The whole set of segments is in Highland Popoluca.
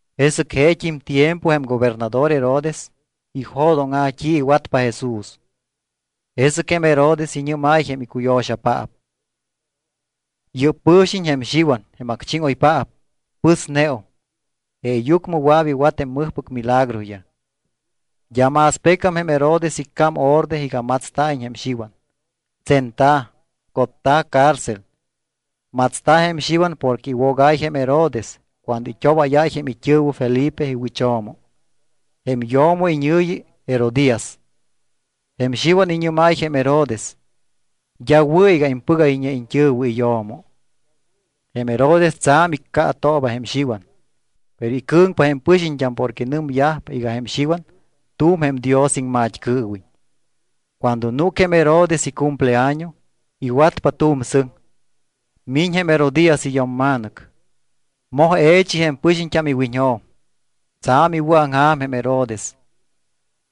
Jesɨc jeet́im tiempo jém gobernador Herodes ijo̱dóŋa̱ t́i iwatpa Jesús. Jesɨc jém Herodes iñɨ́máy jém icuyo̱xapaap: —Yɨ́p pɨ̱xiñ jém Xiwan jém acchíŋoypaap. Pɨsneum. Jeeyucmɨ wɨa̱p iwat jém mɨjpɨc milagroyaj. D́a más pecam jém Herodes icám orde iga matsta̱iñ jém Xiwan. Tsenta̱, cotta̱ cárcel. Matsta̱ jém Xiwan porque iwogáy jém Herodes cuando it́obáyáy jém it́ɨ̱wɨ Felipe iwɨcho̱mo. Jém yo̱mo iñɨ̱yi Herodías. Jém Xiwan iñɨ́máy jém Herodes: —D́a wɨ̱ iga impɨgayñe iñt́ɨ̱wɨ iyo̱mo. Jém Herodes tsa̱m iccaatooba jém Xiwan, pero icɨ̱ŋpa jém pɨxiñt́am porque nɨmyajpa iga jém Xiwan tu̱m jém Dios iŋmat́cɨɨwiñ. Cuando núc jém Herodes icumpleaño, iwatpa tu̱m sɨŋ. Miñ jém Herodías iyo̱mma̱nɨc. Moj e̱chi jém pɨxiñt́am iwiñjo̱m. Tsa̱m iwɨ̱aŋja̱m jém Herodes.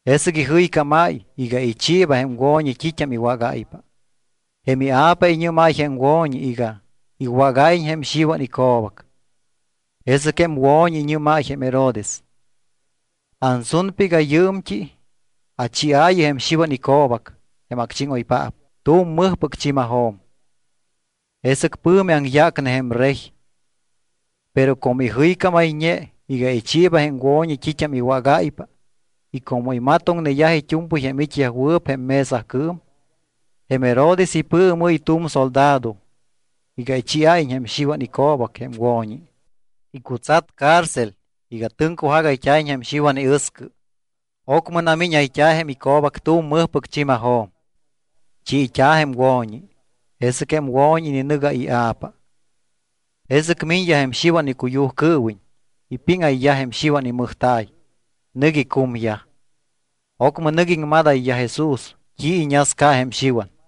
Jesɨc ijɨycámáy iga ichiiba jém wo̱ñi t́it́am iwágáypa. Jém ia̱pa iñɨ́máy jém wo̱ñi iga iwágáyiñ jém Xiwan ico̱bac. Jesɨc jém wo̱ñi iñɨ́máy jém Herodes: —Ansunpa iga yɨɨmt́i achiaayɨ jém Xiwan ico̱bac, jém acchíŋoypaap, tu̱m mɨjpɨc chi̱majo̱m. Jesɨc pɨ̱mi aŋyácne jém rey. Pero como ijɨycámayñe iga ichiiba jém wo̱ñi t́it́am iwágáypa y como imatoŋneyaj it́u̱mpɨy jém it́yajwɨɨp jém mesacɨɨm, jém Herodes ipɨɨmɨ́y tu̱m soldado iga ichiáyiñ jém Xiwan ico̱bac jém wo̱ñi. Icutsat cárcel iga tɨŋcujagayt́a̱iñ jém Xiwan iɨscɨ. Ocmɨ namíñayt́a̱ jém ico̱bac tu̱m mɨjpɨc chi̱majo̱m. Chiit́a̱ jém wo̱ñi. Jesɨc jém wo̱ñi ininɨgáy ia̱pa. Jesɨc miñyaj jém Xiwan icuyujcɨɨwiñ, ipíŋayyaj jém Xiwan imɨjta̱y, nɨc icumyaj. Ocmɨ nɨc iŋmadayyaj Jesús t́i iñasca jém Xiwan.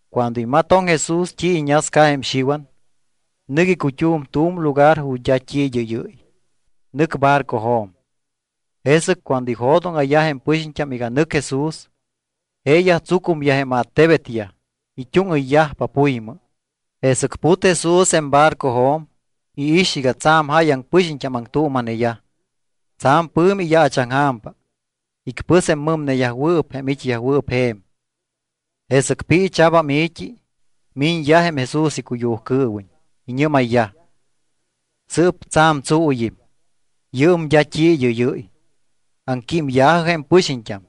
Cuando imatoŋ Jesús t́i iñasca jém Xiwan, nɨc icut́um tu̱m lugar ju̱t́ d́a t́i id́ɨ́yɨ́y. Nɨc barcojo̱m. Jesɨc cuando ijo̱dóŋa̱yaj jém pɨxiñt́am iga nɨc Jesús, jeeyaj tsucumyaj jém attebetyaj. It́úŋɨyyajpa puymɨ. Jesɨc put Jesús jém barcojo̱m, iix iga tsa̱m jáyaŋ pɨxiñt́am aŋtuuma̱neyaj. Tsa̱m pɨ̱mi iyaachaŋja̱mpa. Icpɨs jém mɨmneyajwɨɨp jém it́yajwɨɨp je̱m. Jesɨc piicha̱bam i̱t́i, miñyaj jém Jesús icuyujcɨɨwiñ. Iñɨ́mayyaj: —Sɨɨp tsa̱m tsuuyɨm. Yɨɨm d́a t́i id́ɨ́yɨ́y. Aŋquímya̱jɨ jém pɨxiñt́am.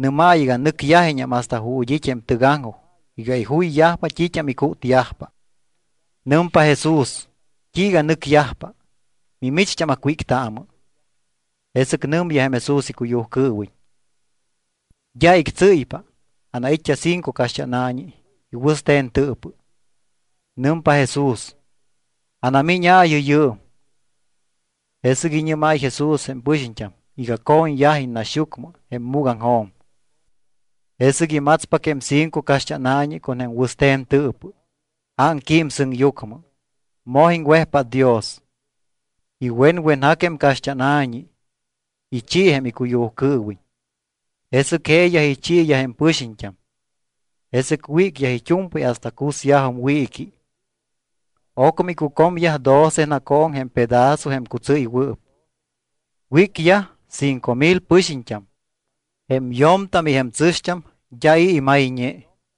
Nɨ́maayɨ iga nɨcyajiññam hasta ju̱t́ it́ jém tɨgaŋjoj iga ijuyyajpa t́it́am icútyajpa. Nɨmpa Jesús: —¿T́iiga nɨcyajpa? Mimicht́am acwíctaamɨ. Jesɨc nɨmyaj jém Jesús icuyujcɨɨwiñ: —D́a ictsɨ́ypa. Anait́t́a cinco caxt́ána̱ñi y wɨste̱n tɨɨpɨ. Nɨmpa Jesús: —Anamíñaayɨ yɨɨm. Jesɨc iñɨ́máy Jesús jém pɨxiñt́am iga co̱ñyajiñ naxyucmɨ jém múgaŋjo̱m. Jesɨc imatspac jém cinco caxt́ána̱ñi con jém wɨste̱n tɨɨpɨ. Ámquím sɨŋyucmɨ, moj iŋwejpát Dios. Iwenwenjac jém caxt́ána̱ñi, ichi jém icuyujcɨɨwiñ. Jesɨc jeeyaj ichiiyaj jém pɨxiñt́am. Jesɨc wícyaj it́u̱mpɨy hasta cusyajum wiiqui. Ocmɨ icucomyaj doce nacooŋ con jém pedazo jém cutsɨ́ywɨɨp. Wícyaj cinco mil pɨxiñt́am. Jém yo̱mtam y jém tsɨ̱xt́am d́a i̱ imayñe.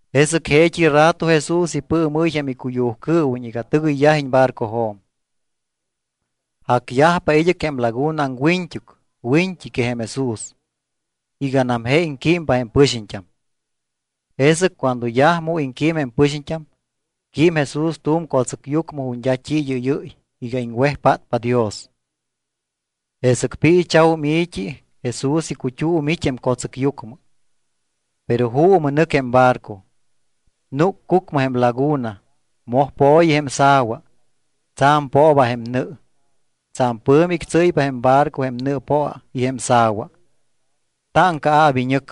Jesɨc jeet́i rato Jesús ipɨɨmɨ́y jém icuyujcɨɨwiñ iga tɨgɨyyajiñ barcojo̱m. Jacyajpa id́ɨc jém laguna aŋwiñt́uc wiñt́i que jém Jesús, iganam je iŋquímpa jém pɨxiñt́am. Jesɨc cuando yaj mu iŋquím jém pɨxiñt́am, quím Jesús tu̱m co̱tsɨcyucmɨ ju̱t́ d́a t́i id́ɨ́yɨ́y iga iŋwejpátpa Dios. Jesɨc piicha̱wum i̱t́i Jesús icut́um it́ jém co̱tsɨcyucmɨ. Pero juumɨ nɨc jém barco. Núc cucmɨ jém laguna, moj po̱yi jém sa̱wa, tsa̱m pooba jém nɨ. Tsa̱m pɨ̱mi ictsɨ́ypa jém barco jém nɨɨpoa y jém sa̱wa. Táŋcaa̱p iñɨc.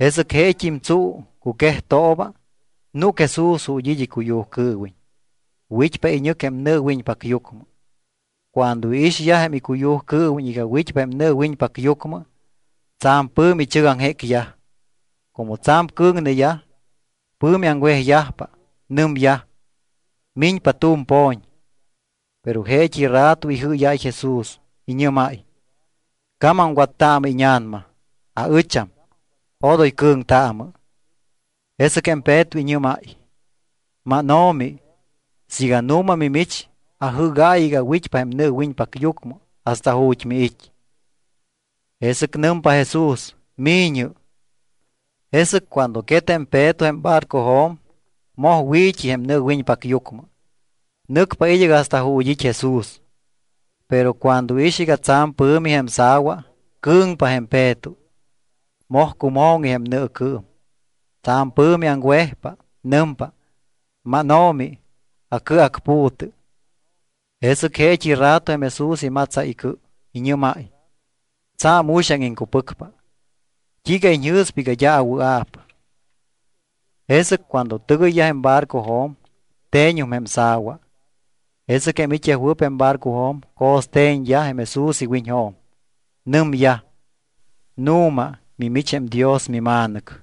Jesɨc jeet́im tsuu, cuquejtooba, núc Jesús ju̱t́ it́ icuyujcɨɨwiñ. Wit́pa iñɨc jém nɨɨwiñpacyucmɨ. Cuando iixyaj jém icuyujcɨɨwiñ iga wit́pa jém nɨɨwiñpacyucmɨ, tsa̱m pɨ̱mi ichɨgaŋjécyaj. Como tsa̱m cɨ̱ŋneyaj, pɨ̱mi aŋwejyajpa. Nɨmyaj: —¡Miñpa tu̱m po̱ñ! Pero jeet́i rato ijɨ́yáy Jesús, iñɨ́máy: —¡Camamwattaamɨ íña̱nama! ¡Aɨcham! ¡Odoy cɨ̱ŋtaamɨ! Jesɨc jém Peto iñɨ́máy: —MánO̱mi, siiga nu̱ma mimich, ajɨ́gaayɨ iga awit́pa jém nɨɨwiñpacyucmɨ hasta ju̱t́ miit́. Jesɨc nɨmpa Jesús: —Mi̱ñɨ. Jesɨc cuando quet jém Peto jém barcojo̱m, moj wi̱t́i jém nɨɨwiñpacyucmɨ. Nɨcpa id́ɨc hasta ju̱t́ it́ Jesús, pero cuando iix iga tsa̱m pɨ̱mi jém sa̱wa, cɨ̱ŋpa jém Peto. Moj cumo̱ŋi jém nɨɨcɨɨm, tsa̱m pɨ̱mi aŋwejpa. Nɨmpa: —¡MánO̱mi, acɨacpu̱tɨ! Jesɨc jeet́i rato jém Jesús imatsáy icɨ, iñɨ́máy: —Tsa̱m uxaŋ iŋcupɨcpa. ¿T́iiga iñjɨ̱spa iga d́a awɨa̱p? Jesɨc cuando tɨgɨyyaj jém barcojo̱m, te̱ñum jém sa̱wa. Jesɨc jém it́yajwɨɨp jém barcojo̱m co̱ste̱ñyaj jém Jesús iwiñjo̱m. Nɨmyaj: —Nu̱ma mimich jém Dios miMa̱nɨc.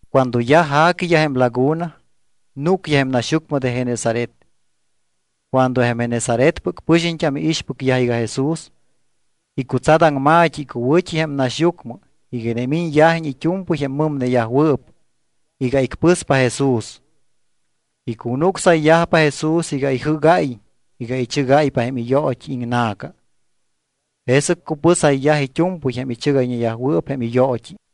Cuando yaj ja̱quiyaj jém laguna, núcyaj jém naxyucmɨ de Genesaret. Cuando jém Genesaretpɨc pɨxiñt́am iixpɨcyaj iga Jesús, icutsat aŋma̱t́i icuwɨ̱t́i jém naxyucmɨ iga inimiñyajiñ it́u̱mpɨy jém mɨmneyajwɨɨp iga icpɨspa Jesús. Icunucsayyajpa Jesús iga ijɨ́gáyiñ iga ichɨgayyajpa jém iyoot́i iŋna̱ca. Jesɨc cupɨsayyaj it́u̱mpɨy jém ichɨgayñeyajwɨɨp jém iyoot́i.